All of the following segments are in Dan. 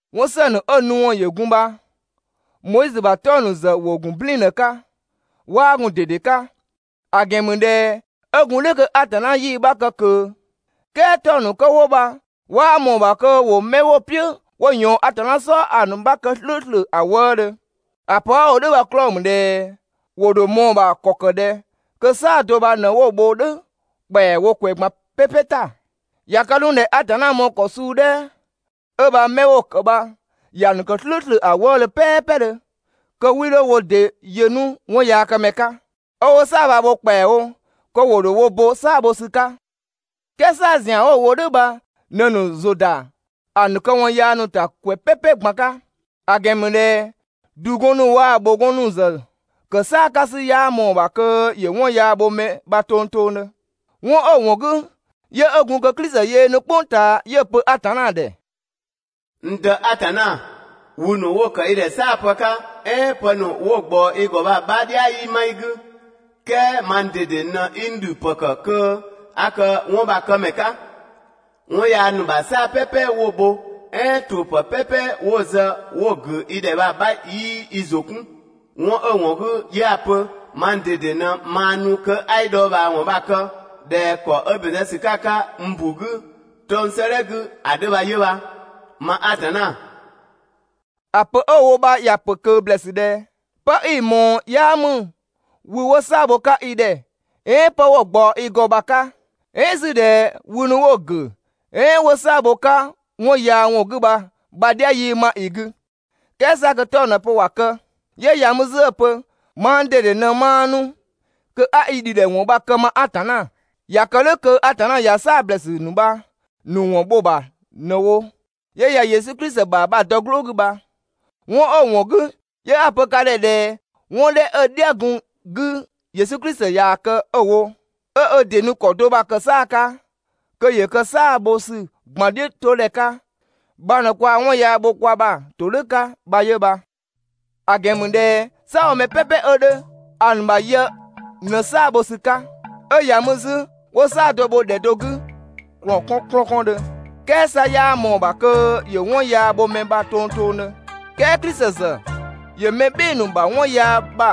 'Wɔn ‑së ‑nu 'ö‑ nu ‑wɔn ‑yö gun bha Moizö ‑bha 'tɔng‑ ‑nu ‑zë ‑wo ‑gun "blɛɛn‑ ꞊në‑ 'ka, 'waa gun‑ ꞊dede 'ka. ‑A ‑gɛn ‑mü ꞊dhɛ 'ö gun "dhʋ̈ kö Atanna 'yii‑ 'bha kë ꞊kö. "Kɛɛ 'tɔng‑ ‑nu kö 'wo bha 'waa ꞊mɔɔ‑ ‑bha kö ‑wo 'mɛ 'wo‑ "piʋ̈ 'wo ꞊yɔɔn Atanna "sɔɔ ‑a ‑nu 'bha kë "slʋ̈ʋ̈slʋ̈ ‑a wëëdhö. ‑A pö 'a‑ wo "dhʋ̈ bha‑ 'klɔɔ‑ ‑mü ꞊dhɛ ‑wo ‑dho ꞊mɔɔ‑ ‑bha ‑kɔ ‑kë ꞊dhɛ kö "saa‑ do bha ꞊në 'wo‑ bho "dhʋ̈ ‑kpɛawo ‑kwɛ ꞊gban "pɛpɛ ‑ta. ꞊Ya kë 'nu ꞊dhɛ Atanna mɔɔ‑ ‑kɔ suu 'dhɛ 'ö bha 'mɛ 'wo‑ ‑kë bha ‑ya ‑nu ‑kë "slʋ̈ʋ̈slʋ̈ ‑a wëëdhö "pɛɛpɛdhö, kö 'wii 'dho wo ‑dɩ yö 'nu 'wɔnyaakëmɛ 'ka, 'ö 'wo "saa‑ bha‑ bho ‑kpɛawo, kö ‑wo ‑dho wo bo "saa‑ bho ‑sü 'ka. "Kɛɛ "saa‑ ‑zian 'wo‑ bho "dhʋ̈ bha ꞊në‑ ‑nu ‑zʋ ‑da ‑a ‑nu këwɔn yaa ‑nu ‑ta ‑kwɛ "pɛpɛ ꞊gban 'ka. ‑A ‑gɛn ‑mü ꞊dhɛ ‑dugɔn ‑nu waa‑ ‑bhʋgɔn ‑nu ‑zë ‑kë "saa‑ 'ka ‑sü 'yaa ꞊mɔɔ‑ ‑bha kö ‑yö 'wɔn yaa bho mɛ ‑bha tongtongdhö. 'Wɔn 'ö‑ ‑wɔn 'gü, 'yö 'ö gun kö Klisi yöö nu "kpʋng ꞊taa 'yö‑ pö Atanna ‑dhɛ: «N Dë Atanna, wü ‑nu 'wo‑ ‑kë i ‑dhɛ "saapë 'ka, "ɛɛn pë ‑nu 'wo‑ ꞊gbaɔ i ‑gɔ bha‑ 'bha "dhia 'yii 'ma i 'gü, "kɛɛ mang ꞊dede ꞊në 'i n ‑dhü ‑pë ‑kë kö 'a kë 'wɔn bha‑ këmɛ 'ka. 'Wɔn yaa ‑nu ‑bha "saa‑ "pɛpɛ 'wo‑ bho, "ɛɛn ‑tuʋ̈ ‑pë "pɛpɛ 'wo‑ zë 'wo‑ ‑gʋ̈ i ‑dhɛ bha‑ 'bha 'yii i ‑zʋ 'kun. 'Wɔn 'ö‑ ‑wɔn 'gü, 'yö 'a‑ pö: Mang ꞊dede ꞊në maa nu kö 'a i dhɔɔbhaawɔn bha‑ kë ꞊dhɛ ‑kɔ 'ö ‑bɛn zë ‑sü 'ka‑ 'ka n ‑bu 'gü 'tɔng‑ 'sëëdhɛ 'gü ‑a 'dhö bha 'yö bha, ma Atanna.» ‑A pö 'ö‑ wo bha ‑ya ‑pö ꞊kö ‑blɛɛsü ꞊dhɛ: «'Pë 'i‑ ꞊mɔɔ 'yaa ‑mü wü 'wo "saa‑ bho‑ 'ka i ‑dhɛ, "ɛɛn 'pë 'wo‑ ꞊gbaɔ i ‑gɔ bha‑ 'ka, "ɛɛn 'zü ꞊dhɛ wü ‑nu 'wo‑ ‑gʋ̈, "ɛɛn 'wo "saa‑ bho‑ 'ka 'wɔn yaa ‑wɔn 'gü bha‑ 'bha "dhia 'yii 'ma i 'gü», "kɛɛ 'sa kö 'tɔng‑ ꞊në‑ pö ‑wa kë. 'Yö ‑ya mü 'zü 'ö‑ pö: «Mang ꞊dede ꞊në maa nu kö 'a i ‑dhidhɛ ‑wɔn bha‑ kë, ma Atanna.» ꞊Ya kë "dhʋ̈ kö Atanna ꞊ya "saa‑ ‑blɛɛsü ‑nu bha‑ ‑nu ‑wɔn bho‑ ‑bha ꞊në‑ bho 'yö ꞊ya Yesu Klisi ‑bha bha dɔ‑ "gblʋ̈ 'gü bha. 'Wɔn 'ö‑ ‑wɔn 'gü 'yö 'a‑ pö ka ‑dhɛ ꞊dhɛ 'wɔn 'dhɛ 'ö‑ "dhia‑ gun‑ 'gü Yesu Klisi ‑ya kë 'ö‑ wo, 'ö ö ‑dɩ nu ‑kɔ do bha‑ ‑kë "saa‑ 'ka kö ‑yö kë "saa‑ bho ‑sü ꞊gban "dhiʋ̈ 'to ‑dhɛ 'ka bha ꞊në kwaa‑ 'wɔn yaa bho kwa ‑bha ‑todhʋ̈ 'ka bha 'yö bha. ‑A ‑gɛn ‑mü ꞊dhɛ "saabhomɛ "pɛpɛ 'ö 'dhö, ‑a ‑nu ‑bha yë ꞊në "saa‑ bho ‑sü 'ka, 'ö ‑ya mü 'zü ‑wo "saa‑ do ‑bho ‑dhɛ do 'gü ‑kplɔn 'kɔn ‑kplɔn 'kɔndhö. "Kɛɛ 'sa 'yaa ꞊mɔɔ‑ ‑bha kö ‑yö 'wɔn yaa bho mɛ ‑bha tongtongdhö. "Kɛɛ Klisi ‑zë ‑yö mɛ "bhɩɩ‑ ‑nu ‑bha 'wɔn yaa ‑bha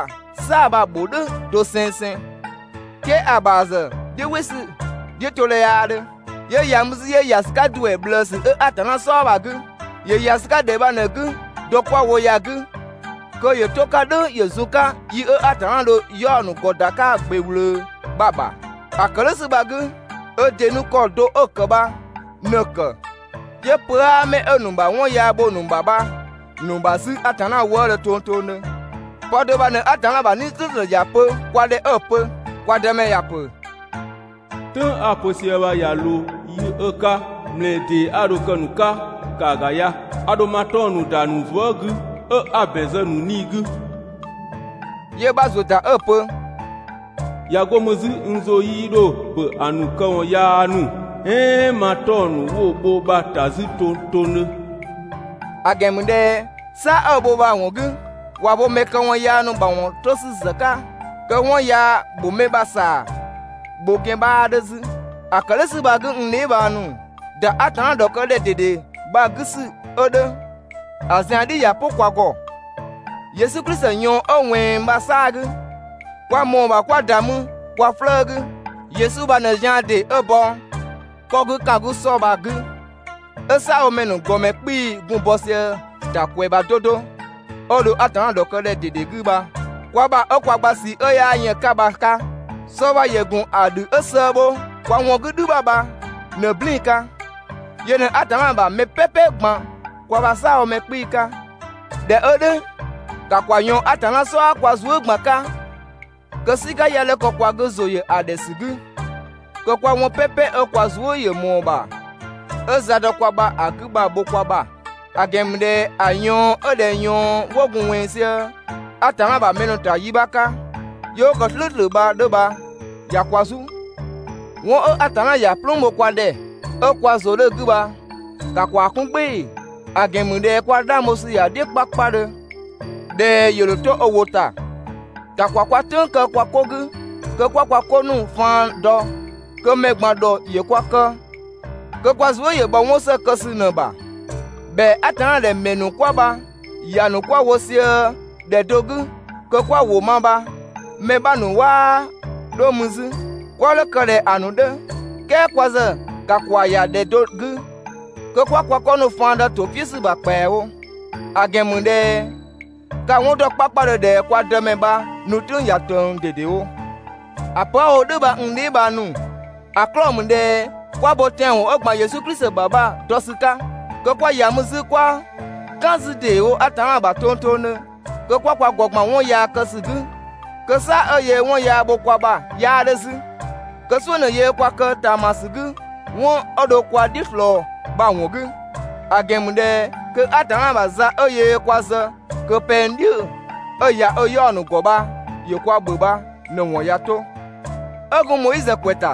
"saa‑ bha‑ ‑bho "dhʋ̈ dosengseng, "kɛɛ ‑a ‑bha ‑zë "dhiʋ̈ "wɩ ‑sü "dhiʋ̈todhɛ 'yaa 'dhö, 'yö ‑ya mü 'zü, 'yö ‑ya ‑sü 'ka ‑duɛ ꞊bhlëësü 'ö Atanna "sɔɔ bha‑ 'gü. ‑Yö ‑ya ‑sü 'ka ‑dhɛ bha ꞊në‑ 'gü dɔ 'kwa‑ wo ya‑ 'gü kö ‑yö 'to‑ 'ka "dhʋ̈ ‑yö zun‑ 'ka yi 'ö Atanna dho‑ 'yaɔ‑ ‑nu ‑gɔ ‑da 'ka‑ ‑gbe ꞊wlöö bha‑ ‑bha. ‑A ‑kë "dhʋ̈ ‑sü bha‑ 'gü, ö ‑dɩ nu ‑kɔ do 'ö‑ ‑kë bha ꞊në‑ ‑kë, 'yö pö 'aa 'mɛ 'ö‑ ‑nu ‑bha 'wɔn yaa bho‑ ‑nu ‑bha bha‑ ‑nu ‑bha 'zü Atanna wëëdhö tongtongdhö. Pë do bha ꞊në Atanna ‑bha 'Nii‑ "slʋ̈ʋ̈slʋ̈ ‑ya pö kwa ‑dhɛ 'pö 'ö‑ pö: «Kwa Dëmɛ ‑ya ‑pö: "Tʋ̈ng 'a‑ pö sië bha ꞊ya ꞊loo yi 'ö‑ 'ka, ‑mlɛɛ ‑dee 'a dho‑ kë‑ ‑nu 'ka, ‑kaa ‑ga ya. A ‑dho ma 'tɔng‑ ‑nu ‑da ‑a ‑nu zuë" 'gü, 'ö 'a‑ ‑bɛn zë‑ ‑nu 'nii‑ 'gü.» 'Yö‑ 'bha ‑zuö ‑ta 'ö‑ pö: «꞊Ya 'go mü 'zü n ‑zʋ 'yii 'dho ‑bö ‑a ‑nu këwɔn yaa ‑nu, "ɛɛn ma 'tɔng‑ ‑nu 'wo‑ bho bha‑ ‑ta 'zü tongtongdhö.» ‑A ‑gɛn ‑mü ꞊dhɛ "saa‑ 'ö‑ bho bha‑ ‑wɔn 'gü, ꞊wa bo mɛ këwɔn yaa ‑nu ‑mawɔn 'to ‑sü ‑zë 'ka, kö 'wɔn yaa ‑bho mɛ ‑bha ‑saa bho ‑gɛn 'bhaa 'dhö 'zü. ‑A ‑kë "dhʋ̈ ‑sü bha‑ 'gü, n dheebhang ‑nu, ‑da Atanna ‑dhɔkë ‑dhɛ ꞊dede bha‑ 'gü ‑sü 'ö 'dhö, ‑a zian "dhi ꞊ya "pʋ kwa ‑gɔ Yesu Klisi ꞊yɔɔn 'ö ꞊wɛnng bha‑ 'saa‑ 'gü. Kwa ‑mɔɔ ‑bha 'kwa ‑da mü kwa 'flëë‑ 'gü. Yesu bha ꞊në zian ‑dee 'ö bɔ 'kɔ 'gü ‑kan 'gü ‑sɔ bha‑ 'gü, 'ö "saabhomɛ ‑nu ‑gɔmɛ 'kpii‑ gun bɔ sië‑ ‑ta ‑kwɛ ‑bha 'do 'do, 'ö dho Atanna ‑dhɔkëdhɛ ꞊dede 'gü bha kwa ‑bha 'ö kwa gba ꞊sii 'ö 'yaa yën‑ 'ka bha‑ 'ka. Sɔ bha ‑yö ‑gun ‑a ‑dhü 'ö sëë bho kwa ‑wɔn 'gü "dhü ‑bha bha ꞊në‑ "blɛɛn‑ 'ka. Yö ꞊në Atanna ‑bha mɛ "pɛpɛ ꞊gban kwa ‑bha "saabhomɛ 'kpii‑ 'ka. ꞊Dhɛ 'ö "dhʋ̈, ‑ka ‑kwa ꞊yɔɔn Atanna "sɔɔ kwa zuë" ꞊gban 'ka, kö "sika 'ya 'dho kë kwa 'gü ‑zʋ ‑yö ‑a ‑dhɛ ‑sü 'gü, kö 'kwa 'wɔn "pɛpɛ 'ö kwa zuë" ‑yö ꞊mɔɔ ‑bha 'ö za dɔ kwa ‑bha ‑a 'gü bha‑ bho kwa ‑bha. ‑A ‑gɛn ‑mü ꞊dhɛ ‑a ꞊yɔɔn 'ö ꞊dhɛ ꞊yɔɔn 'wo gun ꞊wɛnng sië Atanna ‑bha mɛ ‑nu ‑ta yi 'bha 'ka, 'yö 'wo ‑kë "slʋ̈ʋ̈slʋ̈ bha‑ 'dhö bha ꞊ya kwa "zu. 'Wɔn 'ö Atanna ‑ya "plüün bho kwa ‑dhɛ 'ö kwa ‑zʋ 'dhö‑ 'gü bha, ‑ka ‑kwaa 'kun "gbɩɩ‑. ‑A ‑gɛn ‑mü ꞊dhɛ kwa 'dhang bho ‑sü ‑ya "dhiʋ̈ 'kpakpadhö ꞊dhɛ ‑yö ‑dho 'to ö ‑wʋ ‑ta. ‑Ka ‑kwa kwa "tʋ̈ng kë kwa 'ko 'gü kö 'kwa kwa 'ko ‑nu faan dɔ, kö mɛ ꞊gban ‑dhɔ ‑yö kwa kë kö kwa zuë" ‑yö bhɔ 'wɔn ‑së kë ‑sü ꞊në‑ bha. ‑Bhɛa Atanna ‑dhɛ ‑mɛ ‑nu 'kwa bha ‑ya ‑nu 'kwa‑ wo sië ‑dhɛ do 'gü kö 'kwa‑ ‑wʋ ma bha mɛ 'bha ‑nu 'waa 'dho mü 'zü. 'Kwa 'dho‑ kë ꞊dhɛ ‑a ‑nu 'dhö, "kɛɛ kwa ‑zë ‑ka ‑kwa ‑ya ‑dhɛ do 'gü kö 'kwa kwa 'ko ‑nu faan dɔ ‑to "piʋ̈ ‑sü ‑bha ‑kpɛawo, ‑a ‑gɛn ‑mü ꞊dhɛ ka‑ 'wɔn ‑dɔ 'kpakpadhö ꞊dhɛ kwa Dëmɛ bha‑ nu "tʋ̈ng ꞊ya ꞊tëng ꞊dedewo. ‑A pö 'a‑ wo "dhʋ̈ bha, n dheebhang ‑nu, ‑a 'klɔɔ‑ ‑mü ꞊dhɛ 'kwa bo tɛanwɔn 'ö ‑gban Yesu Klisi ‑bha bha‑ dɔ ‑sü 'ka, kö 'kwa ‑ya mü 'zü 'kwa "kan ‑deewo Atanna ‑bha tongtongdhö kö 'kwa kwa ‑gɔ ‑gban 'wɔn yaa kë ‑sü 'gü, kö "saa‑ 'ö yöö 'wɔn yaa bho kwa ‑bha 'yaa 'dhö 'zü. Kö "suʋ̈ ꞊në yöö kwa kë ꞊taamasü 'gü 'wɔn 'ö dho kwa "dhiʋ̈ ꞊slɔɔ bha‑ ‑wɔn 'gü. ‑A ‑gɛn ‑mü ꞊dhɛ kö Atanna ‑bha za 'ö yöö kwa zë kö pɛng "dhiʋ̈‑ 'ö‑ ‑ya ö 'yaɔ‑ ‑nu ‑gɔ bha ‑yö kwa ‑bhö bha ꞊në‑ ‑wɔn ꞊ya 'to. 'Ö gun Moizö ‑kwɛ ‑ta,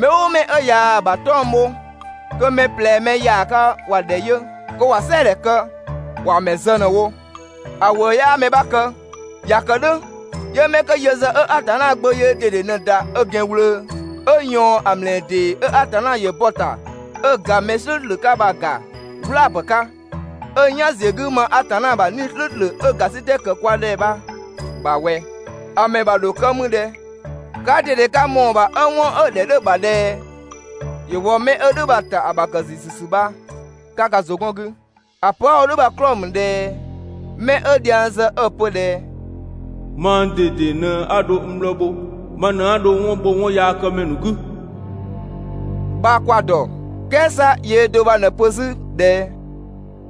mɛ "ʋʋ mɛ 'ö ꞊yaa‑ ‑bha 'tɔng‑ bho, kö mɛ ꞊plɛ mɛ ‑yaaga ‑wa ‑dhɛ yö kö ‑wa "sɛɛdhɛ kë, ‑wa ‑mɛ zë ꞊në‑ wo, ‑a ‑wëë 'yaa mɛ 'bha kë. ꞊Ya kë "dhʋ̈, 'yö 'mɛ 'kö yö ‑zë 'ö Atanna Gbö yöö ꞊dede ꞊në‑ ‑da ö ‑gɛn ꞊wlöö, 'ö‑ ꞊yɔɔn 'ö ‑mlɛɛ ‑dee, 'ö Atanna ‑yö bɔ‑ ‑ta 'ö‑ ‑ga mɛ "slʋ̈ʋ̈slʋ̈ 'ka bha‑ ‑ga "wlaa‑ 'pë 'ka, 'ö "yan ‑ziö 'gü 'ma Atanna ‑bha 'Nii‑ "slʋ̈ʋ̈slʋ̈ 'ö ‑gasitɛ ‑kë 'ka kwa ‑dhɛ bha‑ ‑bha ꞊wɛ, ‑a ‑mɛ ‑bha ‑dho kë mü ꞊dhɛ? Kaa ꞊dede ka ‑mɔɔ ‑bha 'ö 'wɔn 'ö‑ ‑dhɛ 'dhö‑ ‑bha ꞊dhɛ ‑yö wɔ mɛ 'ö "dhʋ̈ bha‑ ‑ta ‑a ‑bha ‑kë ‑ziisü ‑sü bha 'ka ka ‑zʋ 'gɔn‑ 'gü. ‑A pö 'a‑ wo "dhʋ̈ bha‑ 'klɔɔ‑ ‑mü ꞊dhɛ mɛ 'ö dhiang zë 'ö‑ pö ꞊dhɛ: «Mang ꞊dede ꞊në 'a dho n bhlɔɔ bho, ma ꞊në 'a dho 'wɔn bho 'wɔnyaakëmɛ ‑nu 'gü» bha kwa‑ ‑dɔ. "Kɛɛ 'sa yöö do bha ꞊në‑ pö 'zü ꞊dhɛ: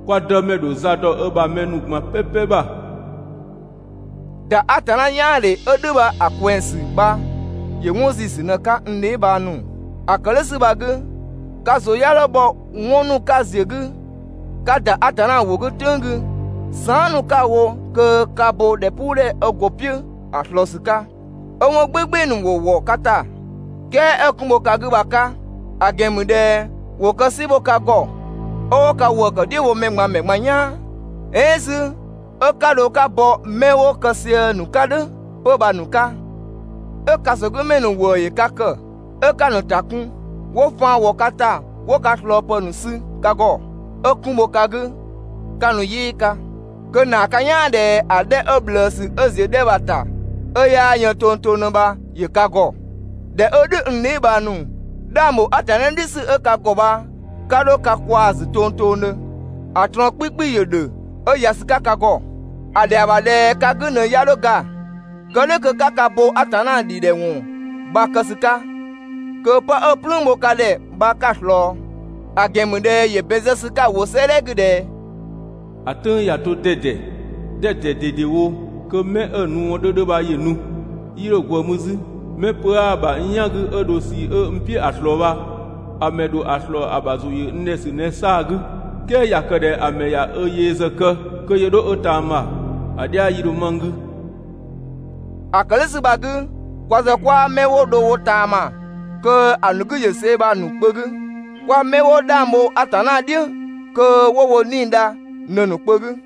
«Kwa Dëmɛ ‑dho za dɔ ö ‑bha mɛ ‑nu ꞊gban "pɛpɛ ‑bha.» ‑Da Atanna "yaandhe 'ö "dhʋ̈ ‑a ꞊kwɛng ‑sü bha ‑yö 'wɔn ‑ziisü ꞊në‑ 'ka, n dheebhang ‑nu. ‑A ‑kë "dhʋ̈ ‑sü bha‑ 'gü, ka ‑zʋ 'ya 'dho bhɔ 'wɔn ‑nu 'ka ‑ziö 'gü ka ‑da Atanna ‑wʋ 'gü "tʋ̈ng 'gü, saan" ‑nu 'ka‑ wo kö 'ka bo ‑dhɛpuudhɛ 'ö go‑ "piʋ̈ ‑a ꞊slɔɔ ‑sü 'ka, 'ö 'wɔn "gbɩɩ‑ "gbɩɩ‑ ‑nu ‑wo ‑wɔ ka ‑ta, "kɛɛ 'ö kun bho ka 'gü bha‑ 'ka. ‑A ‑gɛn ‑mü ꞊dhɛ ‑wo kë "si ‑bho ka ‑gɔ, 'ö 'wo ka ‑wëë ‑kë "dhiʋ̈ wo mɛ ꞊gban ‑mɛ ꞊gban "yaan "ɛɛn 'zü 'ö 'ka dho 'ka bɔ 'mɛ 'wo‑ kë sië‑ ‑nu 'ka "dhʋ̈ 'pö bha‑ ‑nu 'ka. 'Ö ‑kasogümɛ ‑nu ‑wëë ‑yö ka ‑kë, 'ö 'ka‑ ‑nu ‑ta kun, 'wo faan ‑wɔ ka ‑ta 'wo ka ꞊slɔɔpë ‑nu sü ka ‑gɔ, 'ö 'kun bho ka 'gü 'ka‑ nu "yɩɩ 'ka, kö‑ ‑naa ka "yaan ꞊dhɛ ‑a 'dhɛ 'ö ꞊bhlëësü 'ö ‑ziö 'dhɛ bha‑ ‑ta, 'ö 'yaa yën tongtongdhö bha ‑yö ka ‑gɔ. ꞊Dhɛ 'ö "dhʋ̈, n dheebhang ‑nu, 'dhang ‑bho Atanna "dhiʋ̈ ‑sü 'ö ka ‑gɔ bha 'ka 'dho ka kwaa‑ ‑zü tongtongdhö! ‑A ꞊trɔɔn 'kpikpi ‑yö ‑dhö 'ö ‑ya ‑sü 'ka ka ‑gɔ. ‑A ‑dhɛa ‑bha ꞊dhɛ ka 'gü ꞊në ꞊ya 'dho ga, kë "dhʋ̈ kö 'ka ka bo Atanna ‑dhidhɛ ‑wɔn bha‑ kë ‑sü 'ka, kö 'pë 'ö‑ "plüün bho ka ‑dhɛ bha 'ka‑ ꞊slɔɔ. ‑A ‑gɛn ‑mü ꞊dhɛ ‑yö ‑bɛn zë ‑sü 'ka‑ ‑wʋ 'sëëdhɛ 'gü ꞊dhɛ: «‑A "tʋ̈ng ꞊ya 'to 'dɛdɛ, 'dɛdɛ ꞊dedewo kö 'mɛ 'ö‑ nu ‑wɔn 'dhö 'dhö bha ‑yö nu, 'yii 'dho ꞊gwëë mü 'zü. 'Mɛ pö 'aa ‑bha n "yan 'gü 'ö dho ꞊sii 'ö n "piʋ̈ ‑a ꞊slɔɔ bha ‑a ‑mɛ ‑dho ‑a ꞊slɔɔ ‑a ‑bha ‑zʋ ‑yö n ‑dhɛ ‑sü ꞊në‑ 'saa‑ 'gü. "Kɛɛ ꞊ya kë ꞊dhɛ ‑a mɛ ꞊ya ö yee ‑zë kë kö ‑yö 'dho ö ꞊taama, ‑a "dhia 'yii 'dho 'ma n 'gü.» ‑A ‑kë "dhʋ̈ ‑sü bha‑ 'gü, kwa ‑zë 'kwaa 'mɛ 'wo dho wo ꞊taama kö ‑a ‑nu 'gü ‑yö ꞊see bha‑ ‑nu kpö 'gü, kwa 'mɛ 'wo 'dhang bho Atanna "dhiʋ̈ kö 'wo wo 'nii‑ dha ꞊në‑ ‑nu kpö 'gü.